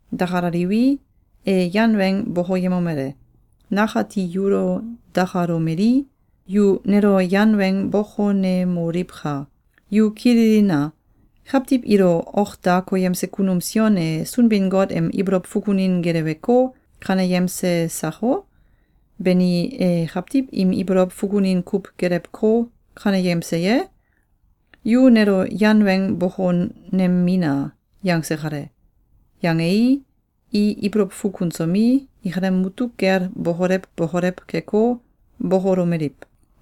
Dakalaliwi, e yan weng bokoyemomele: “Nakati yulo dakalomelii, yu nelo yan weng bokonemoliwka! Yu kililina! Kawtiw ilo ok da koyemse kunum Sion e Sunbin-Got em ibolow fukunin geleweko, kaneyemse sako? Bani, e kawtiw im ibolow fukunin kuw gelewko, kaneyemse ye? Yu nelo yan weng bokonemina!”, yangse kale. Yangei, i ibolow fukunsomi, ikalem mutuk kel bokolew bokolew keko, bokolomeliw: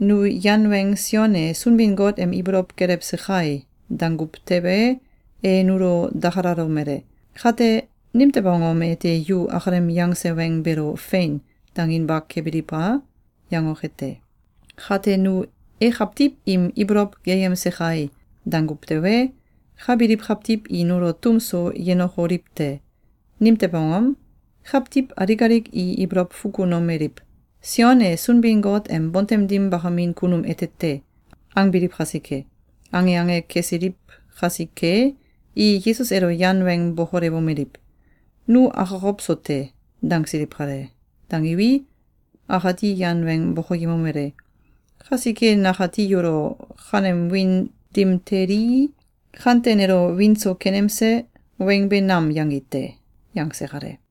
“Nu yan weng ‘Sion e Sunbin-Got em ibolow gelewse kai!’, danguw tewe, e nulo dakalalomele: ‘Kate, nimtew angom ete yu akalem yangse weng beelo ‘Fein!’, danginba kebiliw a?’, yangoke te. Kate nu ‘E kawtiw im ibolow geyemse kai!’, danguw tewe, ka biliw kawtiw i nulo tum so yenokoliw te. Nimtew angom? Kawtiw alik alik i ibolow fukunomeliw: ‘Sion e Sunbin-Got em bontem dim bakamin kunum ete te!’, angbiliw kasike!”, ange ange kesiliw kasike, i Yesus elo yan weng bokolewomeliw: “Nu akokow so te!”, dangsiliw kale. Dangiwi, akati yan weng bokoyemomele: “Kasike nakati yulo ‘Kanem wiin dim telii, kante nelo wiin so kenemse!’, weng be nam yangi te!”, yangse kale.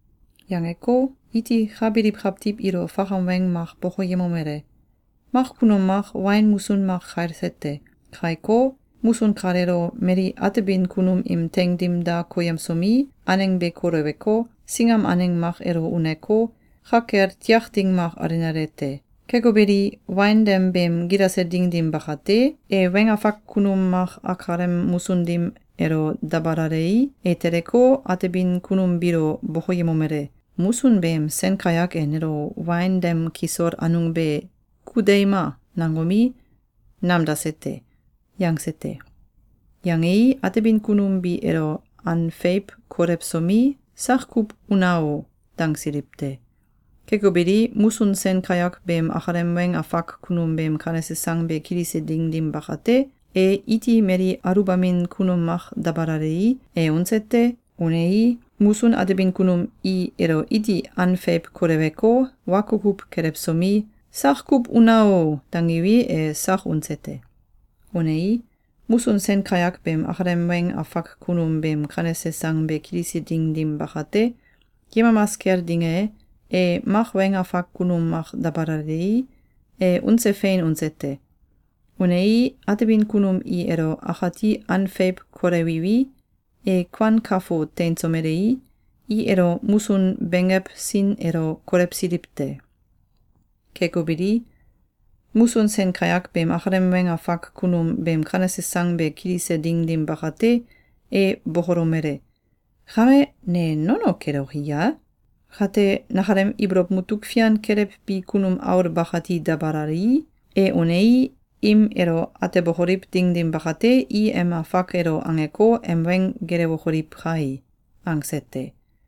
Yangeko, iti ka biliw kawtiw ilo fakam weng mak bokoyemomele: “Mak kunum mak wain musun mak kailse te. Kaiko, musun kaleelo mali atebin kunum im teing dim da koyemsomi, aneng be koleweko, singam aneng mak elo uneko, ka kel tiak ding mak alenale te. Keko beli, wain dem beem gilase ding dim bakate, e weng afak kunum mak akalem musun dim elo dabalalei, e teleko, atebin kunum biilo bokoyemomele: ‘Musun beem sen kayak e nelo wain dem kisol anung be ‘Ku deima!’, nangomi, namdase te.’, yangse te. Yangei, atebin kunum bi elo an feiw kolewsomi, ‘Sak kuw una o!’, dangsiliw te. Keko beli, musun sen kayak beem akalem weng afak kunum beem kanese sang be kilise ding dim bakate, e iti mali aluwbamin kunum mak dabalalei, e unse te. Unei, musun atebin kunum i elo iti an feiw koleweko, wa kukuw kelewsomi, ‘Sak kuw una o!’, dangiwi, e sak unse te. Unei, musun sen kayak beem akalem weng afak kunum beem kanese sang be kilise ding dim bakate, yemamas kel ding e, e mak weng afak kunum mak dabalalei, e unse fein unse te. Unei, atebin kunum i elo akati an feiw kolewiwi, e kuan kafo teinsomelei, i elo musun benggew sin elo kolewsiliw te. Keko beli, musun sen kayak beem akalem weng afak kunum beem kanese sang be kilise ding dim bakate, e bokolomele: ‘Kame, ne nono keloki ye? Kate, nakalem ibolow mutuk fian kelewbi kunum aul bakati dabalalii, e unei, im elo atebokoliw ding dim bakate, i em afak elo angeko, em weng gelewokoliw kai!’, angse te.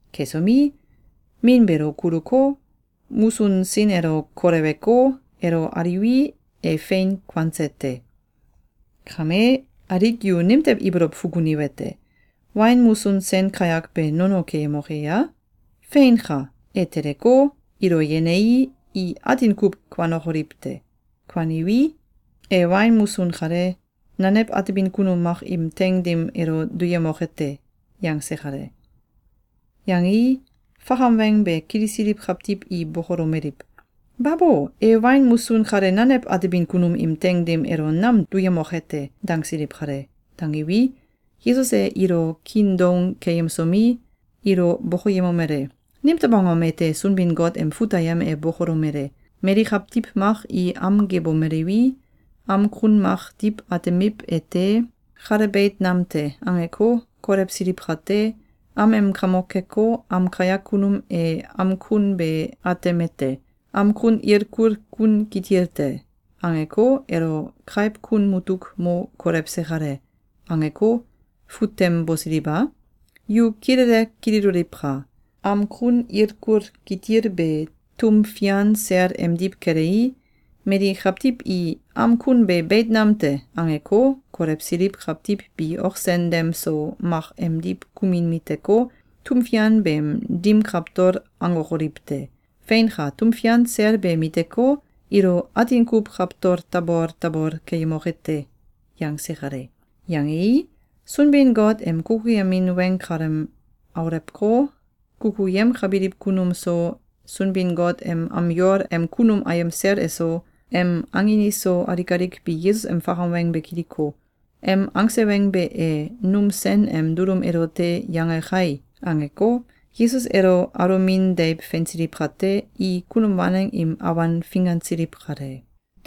Kesomi, min beelo kuluko, musun sin elo koleweko, elo aliwi, e fein kuanse te. Kame, alik yu nimtew ibolow fukuniwete: Wain musun sen kayak be nono keyemoke ya? Feinka! E teleko, ilo yenei, i atin kuw kuanokoliw te. Kuaniwi, e wain musun kale, nanew atebin kunum mak im teing dim elo duyemoke te.”, yangse kale. Yangei, fakam weng be kilisiliw kawtiw i bokolomeliw: “Babo! E wain musun kale nanew atebin kunum im teing dim elo nam duyemoke te!”, dangsiliw kale. Dangiwi, Yesus e ilo kiin doung keyemsomi, ilo bokoyemomele: “Nimtew angom ete Sunbin-Got em fut ayem e bokolomele: ‘Mali kawtiw mak i am gebomeliwi, am kun mak diw atemiw ete, ‘Kale beit nam te!’, angeko, kolewsiliw kate, am em kamok keko, am kayak kunum e am kun be atemete, ‘Am kun ilkul kun kitil te!’, angeko, elo kaiw kun mutuk mo kolewse kale.’, angeko, fut tem bosiliw a? Yu kilele kililoliwka! Am kun ilkul kitil be tum fian sel emdiw kelei, mali kawtiw i ‘Am kun be beit nam te!’, angeko, kolewsiliw kawtiw bi ok sen dem so mak emdiw kumin miteko, tum fian beem dim kawtol angokoliw te. Feinka! Tum fian sel be miteko, ilo atin kuw kawtol tabol tabol keyemoke te.”, yangse kale. Yangei, Sunbin-Got em kukuyemin weng kalem aulewko, kukuyemkabiliw kunum so, Sunbin-Got em am yol em kunum ayem sel eso, em angin iso, alik alik bi Yesus em fakam weng be kiliko, ‘Em angse weng be e num sen em dulum elote yange kai!’, angeko, Yesus elo alomin deiw feinsiliw kate, i kunum waneng im awan fingansiliw kale.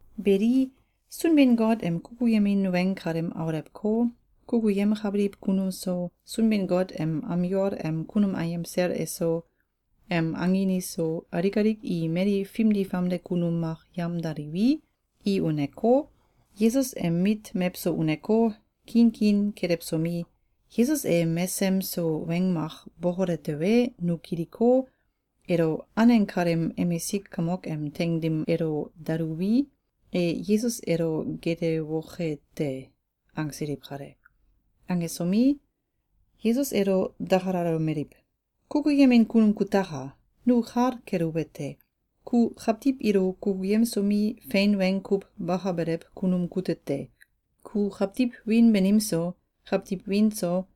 Beli, Sunbin-Got em kukuyemin weng kalem aulewko, kukuyemkabiliw kunum so, Sunbin-Got em am yol em kunum ayem sel eso, em angin iso, alik alik i mali fimdi famde kunum mak yamdaliwi, i uneko, Yesus em mit mewso uneko, kiin kiin kelewsomi, “Yesus e mesem so weng mak bokole tewe, nu kiliko, elo aneng kaleem emisik kamok em teing dim elo daluwi, e Yesus elo geelewoke te.”, angsiliw kale. Angesomi, Yesus elo dakalalomeliw: “Kukuyemin kunum kutaka! Nu kal keluwete: Ku kawtiw ilo kukuyemsomi, fein weng kuw bakabelew kunum kute te! Ku kawtiw wiin banim so, kawtiw wiin so,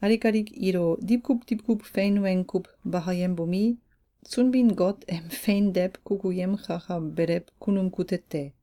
alik alik ilo diwkuw diwkuw fein weng kuw bakayembomi, Sunbin-Got em fein deiw kukuyemkakabelew kunum kute te.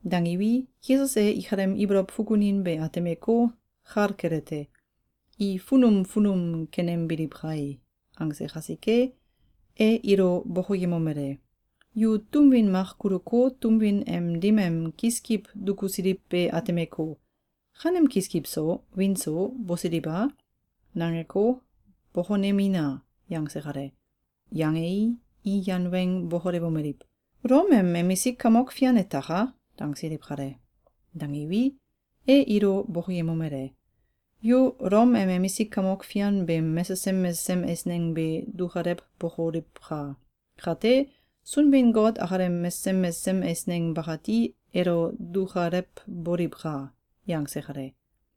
Dangiwi, Yesus e ikalem ibolow fukunin be atemeko, kal kelete: ‘I funum funum kenembiliw kai!’, angse kasike, e ilo bokoyemomele: “Yu tum win mak kuluko, tum win em dim em kiskiw dukusiliw be atemeko, ‘Kanem kiskiw so, wiin so, bosiliw a?’, nangeko, bokonemina!”, yangse kale. Yangei, i yan weng bokolewomeliw: “Ulom em emisik kamok fian etaka!”, dangsiliw kale. Dangiwi, e ilo bokoyemomele: “Yu Ulom em emisik kamok fian beem mesesem mesesem eisneng be dukalewbokoliwka! Kate, Sunbin-Got akalem mesesem mesesem eisneng bakati elo dukalewboliwka!”, yangse kale.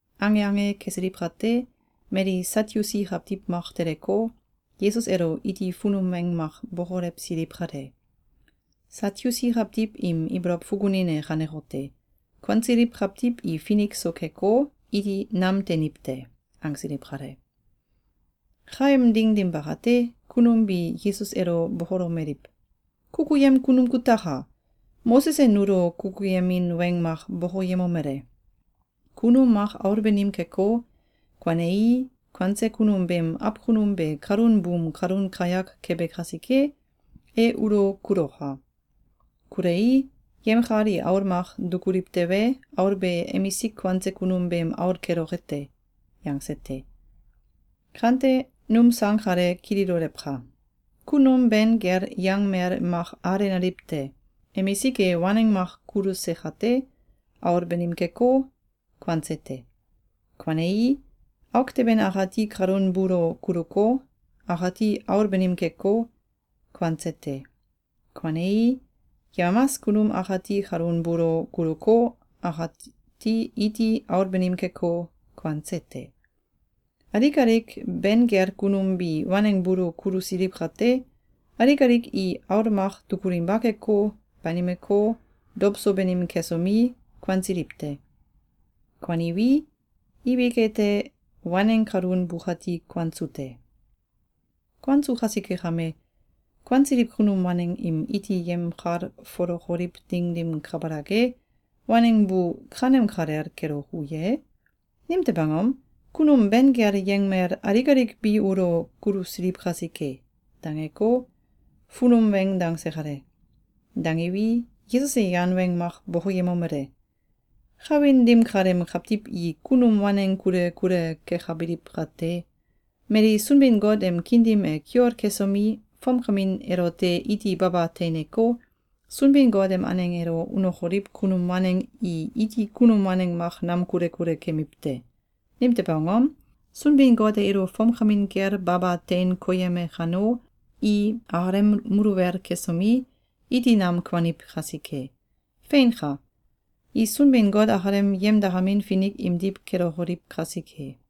Ange ange kesiliw kate, mali Satyusi kawtiw mak teleko, Yesus elo iti funum weng mak bokolewsiliw kale. (Satyusi kawtiw im ibolow fukunin e kanekote: “Kuansiliw kawtiw i finik so keko, iti nam teiniw te!”, angsiliw kale.) Kaem ding dim bakate, kunum bi Yesus elo bokolomeliw: “Kukuyemin kunum kutaka! Moses e nulo kukuyemin weng mak bokoyemomele: ‘Kunum mak aul banim keko, kuanei, kuanse kunum beem awkunum be kalun buum kalun kayak kebe kasike, e ulo kuloka! Kulei, yemkal i aul mak dukuliw tewe, aul be emisik kuanse kunum beem aul keloke te.’, yangse te. Kame, num sang kale kililolewka! Kunum ben kel yangmel mak alenaliw te. Emisik e waneng mak kuluse kate, aul banim keko, kuanse te. Kuanei, auk teben akati kalun buulo kuluko, akati aul banim keko, kuanse te. Kuanei, yemamas kunum akati kalun buulo kuluko, akati iti aul banim keko, kuanse te. Alik alik ben kel kunum bi waneng buulo kulusiliw kate, alik alik i aul mak dukulinba keko, banimeko, dow so banim kesomi, kuansiliw te. Kuaniwi, ibik ete, waneng kalun bukati kuansu te. Kuansu kasike kame, kuansiliw kunum waneng im iti yemkalfolokoliw ding dim kabalak e, waneng bu kanem kalel keloku ye? Nimtew angom? Kunum ben kel yangmel alik alik bi ulo kulusiliw kasike.”, dangeko, funum weng dangse kale. Dangiwi, Yesus e yan weng mak bokoyemomele: “Kawin dim kaleem kawtiw i kunum waneng kule kule kekabiliw kate, mali Sunbin-Got em kiin dim e kiol kesomi, fomkamin elote iti baba teineko, Sunbin-Got em aneng elo unokoliw kunum waneng i iti kunum waneng mak nam kule kule kemiw te. Nimtew angom? Sunbin-Got e ilo fomkamin kel baba tein koyeme kano, i akalem muluwel kesomi, iti nam kuaniw kasike. Feinka! I Sunbin-Got akalem yemdakamin finik imdiw kelokoliw kasike.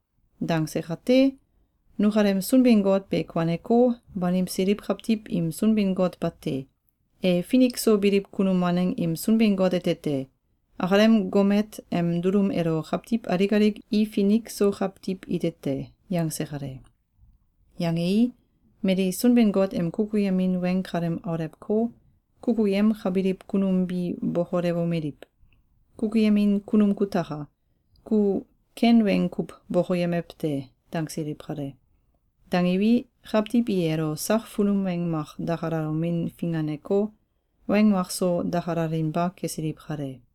Dangse kate, nukalem Sunbin-Got be kuaneko, banimsiliw kawtiw im Sunbin-Got bate! E Finik so biliw kunum waneng im Sunbin-Got ete te! Akalem gomet em dulum elo kawtiw alik alik i finik so kawtiw ite te.”, yangse kale. Yangei, mali Sunbin-Got em kukuyemin weng kalem aulewko, kukuyemkabiliw kunum bi bokolewomeliw: “Kukuyemin kunum kutaka! Ku ken weng kuw bokoyemew te!”, dangsiliw kale. Dangiwi, kawtiw i elo sak funum weng mak dakalalomin finganeko, weng makso dakalalinba kesiliw kale.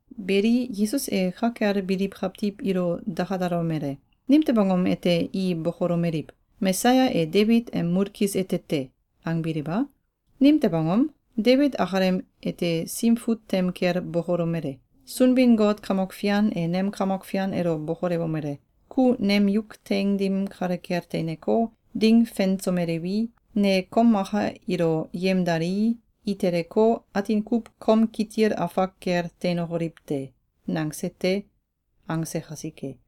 Beli, Yesus e ka kel biliw kawtiw ilo dakalalomele: “Nimtew angom ete i bokolomeliw: ‘Mesaya e Debit em mulkis ete te!’, angbiliw a? Nimtew angom? Debit akalem ete Sim Fut tem kel bokolomele: ‘Sunbin-Got Kamok Fian e nem Kamok Fian elo bokolewomele: ‘Ku nem yuk teing dim kale kel teineko, ding fensomelewi, ne kom maka ilo yemdalii, i teleko, atin kuw kom kitil afak kel teinokoliw te.’, nangse te.’, angse kasike.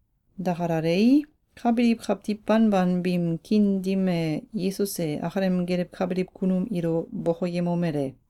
Dakalalei, ka biliw kawtiw banban biim kiin dim e Yesus e akalem gelewkabiliw kunum ilo bokoyemomele: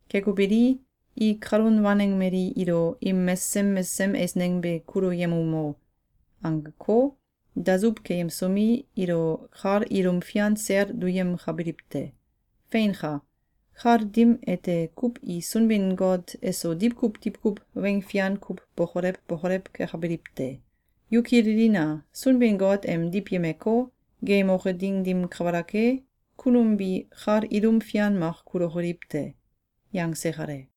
Keko beli, i kalun waneng mali ilo ‘Im mesesem mesesem eisneng be kuluyemumo!’, angeko, dasuw keyemsomi, ilo kal ilum fian sel duyemkabiliw te. Feinka! Kal dim ete kuw i Sunbin-Got eso diwkuw diwkuw weng fian kuw bokolew bokolew kekabiliw te. Yu kililina! Sunbin-Got em diwyemeko, geeyemoke ding dim kabalak e, kunum bi kal ilum fian mak kulokoliw te!”, yangse kale.